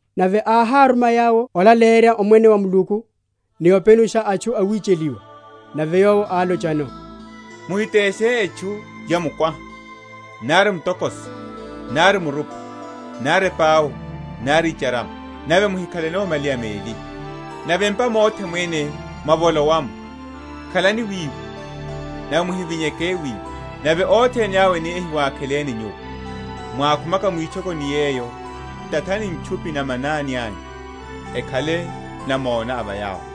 Nave áháruma yawo olaleyerya Omwene wa Muluku, ni openusha atchu awicheliwa. Nave Yowo álochano, Muhiteshe etchu ya mukwaha, nari mutokoso, nari murupa, nari epau, nari icharama; nave muhikhaleno malaya meli. Nave m’pa mothe mwene mwavolowa’mo, khalani wiwo, nave mwavinyeryeke wiwo. Nave othene yawo eni ehiwakheleni nyuwo, mwákhumaka mwitchokoni yeyo, tathani ntchupi na va manani anyu, akhale namona a va yawo.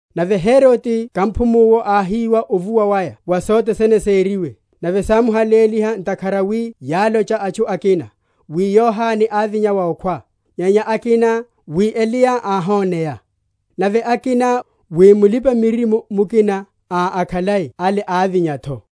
Nave Herode kamphumu’wo áhiwa ovuwa waya wa sothe sene sériwe; nave sámuhaléliha, ntakhara wi yálocha atchu akina, wi Yohane ávinya wa okhwa; nyenya akina, wi Eliya áhoneya; nave akina, wi mulipa‐miririmo mukina a akhalai ale ávinya’tho.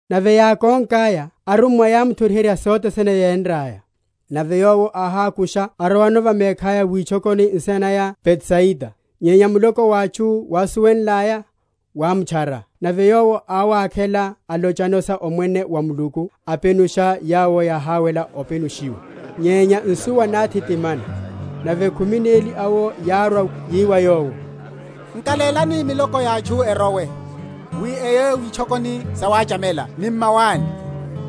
Nave yákonkaya arummwa, yámuthoriherya sothe sene yénraya. Nave Yowo áhákusha, arowano va mekhaya witchokoni nsina naya Betsaida. Nyenya muloko wa atchu, wásuwenlaya, wámutchara; nave Yowo áwakhela, alochano sa Omwene wa Muluku, apenusha yawo yahawela openushiwa. Nyenya nsuwa náthitimana; nave khumi neli awo yárwa, yi wa Yowo, Nkalélani miloko ya atchu erowe, wi eye witchokoni sawachamela ni m’mawani,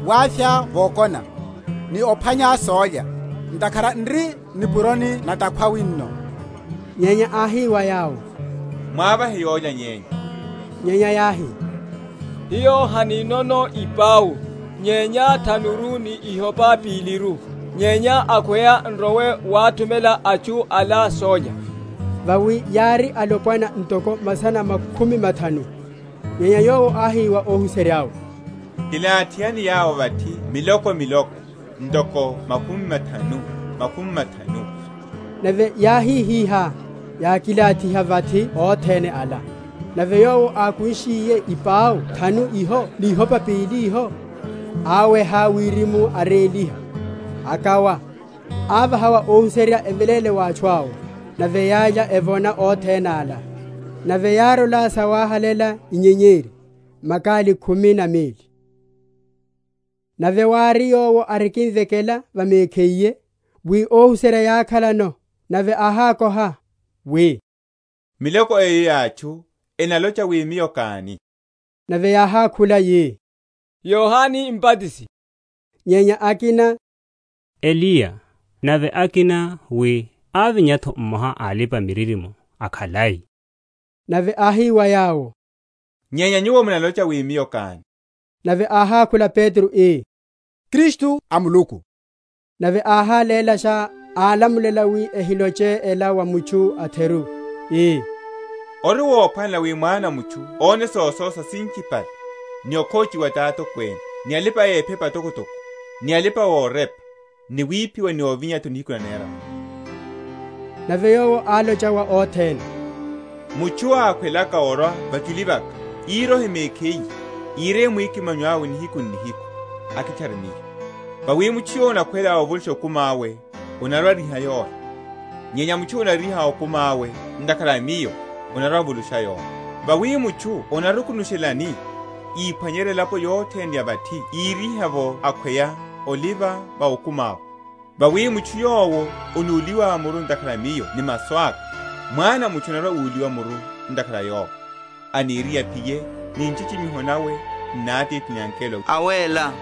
wavya vokona, ni ophwanya sólya; ntakhara n’ri o nipuroni na’takhwa wino. Nyenya áhi wa yawo, mwavahe olya yenyu. Nyenya yáhi, Hiyo haninono ipau, nyenya thanuru ni ihopa piliru; nyenya akhweya n’rowe wáthumela atchu ala sólya. Vawi yári alopwana ntoko masana makhumi mathanu. Nyenya Yowo áhi wa óhuserya’we, Kilathihani yawo vathi miloko miloko, ntoko makhumi mathanu, makhumi mathanu. Nave yáhihihá, yakilathiha vathi othene ala. Nave Yowo, ákunshiye ipau thanu iho ni ihopa pili iho, áweha wirimu, aréliha, akawa, avaha wa óhuserya eveléle wa atchu awo. Nave yálya, evona othene ala; nave yárola sawahalela inyenyeri, makali khumi na meli. Yesu tani? Nave wári, Yowo arikimvekela va mekhiye, wi óhuserya yákhalano; nave áhákoha, wi, Miloko eyo ya atchu enalocha wi Miyo káni? Nave yáhákhula yi, Yohane Mbatisi; nyenya akina, Eliya; nave akina, wi ávinya’tho mmoha a alipa‐miririmo akhalai. Nave áhi wa yawo, Nyenya nyuwo munalocha wi Miyo káni? Nave áhákhula Petro, ii, Kristu a Muluku. Nave áhálélasha, álamulela wi ehiloche ela wa mutchu a’theru; ii, Ori wophwanela wi Mwana a mutchu óne sososa sinchipale, ni okhochiwa ti atokwene, ni alipa‐ephepa atokotoko, ni alipa‐orepa, ni wiphiwa, ni ovinya’tho nihiku naneraru. Sa wireya mwikimanyo. Nave Yowo álocha wa othene, Mutchu ákhwelaka orwa vachuli vaka, írohe mekhiye, íreye mwikimanyo awe nihiku n’nihiku, akitchare Miyo. Vawi mutchu yowo anakhwela ovulusha okumi awe, anarwa‐ariha yola; nyenya mutchu yowo anariha okumi awe, ntakhara a Miyo, anarwa‐avulusha yola. Vawi mutchu anarukunushelani, íphwanyerya elapo yothene ya vathi íriha’vo akhweya oliva’vo okumi awe? Vawi mutchu yowo anúliwa muru ntakhara a Miyo ni masu aka, Mwana a mutchu anarwa‐úliwa muru ntakhara a Yowo, aniriye aphiye ni nchichimiho nawe n’na Atithi, n’na angelo awéla.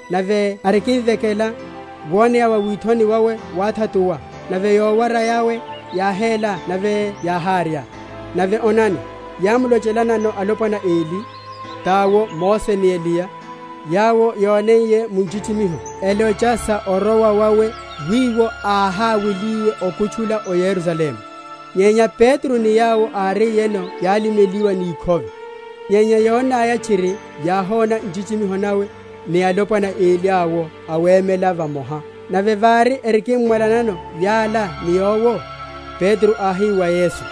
Nave arikimvekela, woneya wa withoni wawe wáthatuwa, nave yowara yawe yáhéla nave yáhárya. Nave onani, yámlochelanano alopwana eli, tawo Mose ni Eliya; yawo yóneiye mu nchichimiho, elocha sa orowa wawe wiwo áhaweliye okutchula o Yerusalemu. Nyenya Petro ni yawo áriyeno yálimeliwa ni ikhove; nyenya yonaya tchiri, yáhona nchichimiho nawe, ni alopwana eli awo awemelano vamoha, Nave vári erikimmwalanano yala ni Yowo, Petro áhi wa Yesu,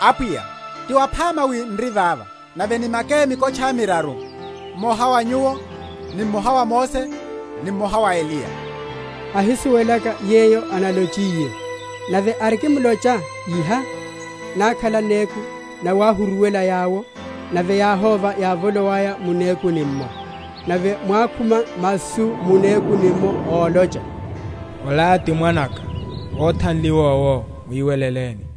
Apwiya, ti waphama wi n’ri vava; nave nimake mikotcha miraru, mmoha wa Nyuwo, ni mmoha wa Mose, ni mmoha wa Eliya; ahisuwelaka yeyo analochiye. Nave arikimlocha iha, nákhala néku, nawahuruwela yawo: nave yáhóva yávolowaya mu nekuni’mmo. Nave mwákhuma masu mu nekuni’mmo ólocha, Ola ti Mwana’ka, óthanliwa owo; mwiweleleni.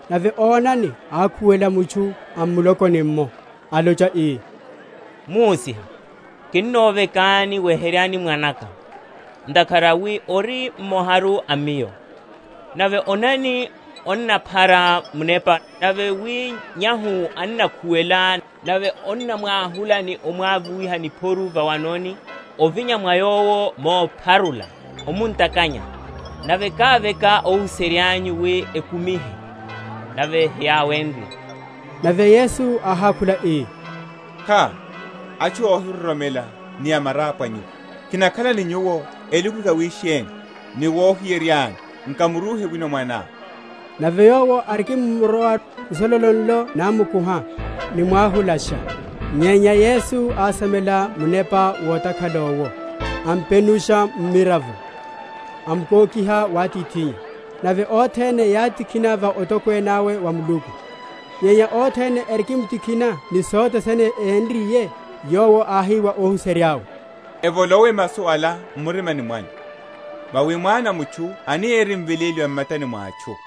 Nave onani ákhuwela mutchu a m’mulokoni’mmo, alocha, ii, Muhusiha, kinovekani, weheryani mwana’ka; ntakhara wi ori mmoharu a miyo: nave onani, onnamphara munepa, nave wi nyahu annakhuwela; nave onnamwahula ni omwavuwiha niphoru vawanoni, ovinya mwa yowo mopharula, omuntakanya. Nave káveka óhuserya’nyu wi ekumihe; nave heyáwenrye. Nave Yesu áhákhula, ii, Kha, atchu óhiroromela ni amarapwa nyuwo, kinakhala ni nyuwo elukuluku yawisheni, ni wohiyereryani? nkamurúhe wino mwaná. Nave yowo arikimórwa, nsololo nlo námukuha, nimwahulasha. Nyenya Yesu ásamela munepa wotakhala owo, ampenusha mmiravo, amkokiha wa atithinnya. Nave othene yátikhina va otokwene awe wa Muluku. Nyenya othene erikimtikhina ni sothe sene énriye, Yowo áhi wa óhuserya’we, Evolowe masu ala m’maruni mwanyu: vawi Mwana a mutchu anirimveléliwa m’matani mwa atchu.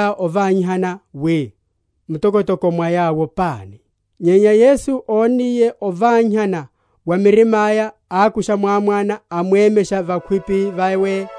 Nave yápacherya ovanyihana wi, mtokotoko mwa yawo pani? Nyenya Yesu ónniye ovanyihana wa mirima’ya, ákusha mwámwana, amwemesha vakhwipi vawe,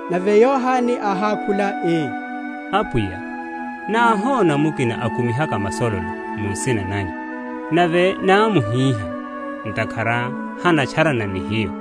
Nave Yohane áhákhula ii, Apwiya, náhóna mukina akumihaka masololo mu nsina nanyu; nave námuhiha, ntakhara hanatcharana ni hiyo.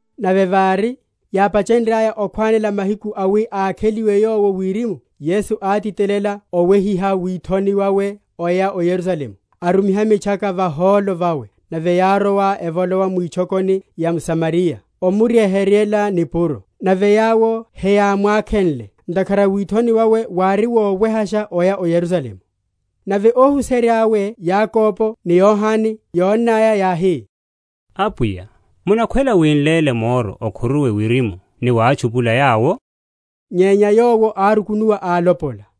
Nave vári, yápachenryaya okhwanela mahiku awi ákheliwe Yowo Wirimu, Yesu átitelela owehiha withoni wawe oya o Yerusalemu, arumiha mitchaka vahólo vawe; nave yárowa, evolowa mwitchokoni ya aSamariya, omuryeheryela nipuro. Nave yawo heyámwakhenle, ntakhara withoni wawe wári wowehasha oya o Yerusalemu. Nave óhuserya’we Yakobo ni Yohane yónnaya, yáhi, Apwiya, munakhwela wi n’léle moro okhuruwe wirimu ni watchupula yawo? Nyenya Yowo árukunuwa álopola.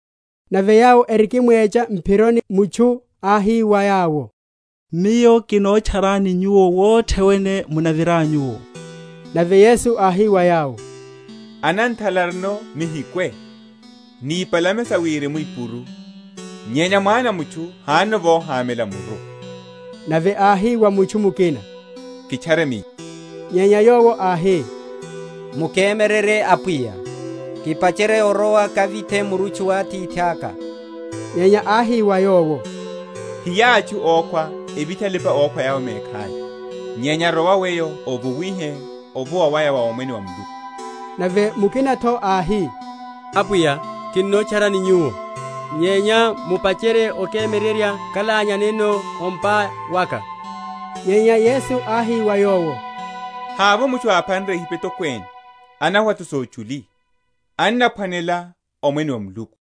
Nave yawo erikimwecha m’phironi, mutchu áhi wa Yowo, Miyo kinotcharani Nyuwo wothe wene munaviranyu’wo. Nave Yesu áhi wa yowo, Ananthala arino mihikhwe, ni ipalame sa wirimu ipuru, nyenya Mwana a mutchu hanono vohamela muru. Nave áhi wa mutchu mukina, Kitchare Miyo. Nyenya yowo áhi, Mukemyererye Apwiya, kipacherye orowa kavithe murutchu wa atithaka. Nyenya áhi wa yowo, Hiya atchu ókhwa evithe alipa‐okhwa a yawo mekhaya; nyenya rowa weyo ovuwihe ovuwa waya wa Omwene wa Muluku. Nave mukina’tho áhi, Apwiya kinotcharani Nyuwo; nyenya mupacherye okemyererya kalanyaneno a o’mpa waka. Nyenya Yesu áhi wa yowo, Havovo mutchu aphanre ehipa etokwene, anaweha’tho sochuli, anaphwanela Omwene wa Muluku.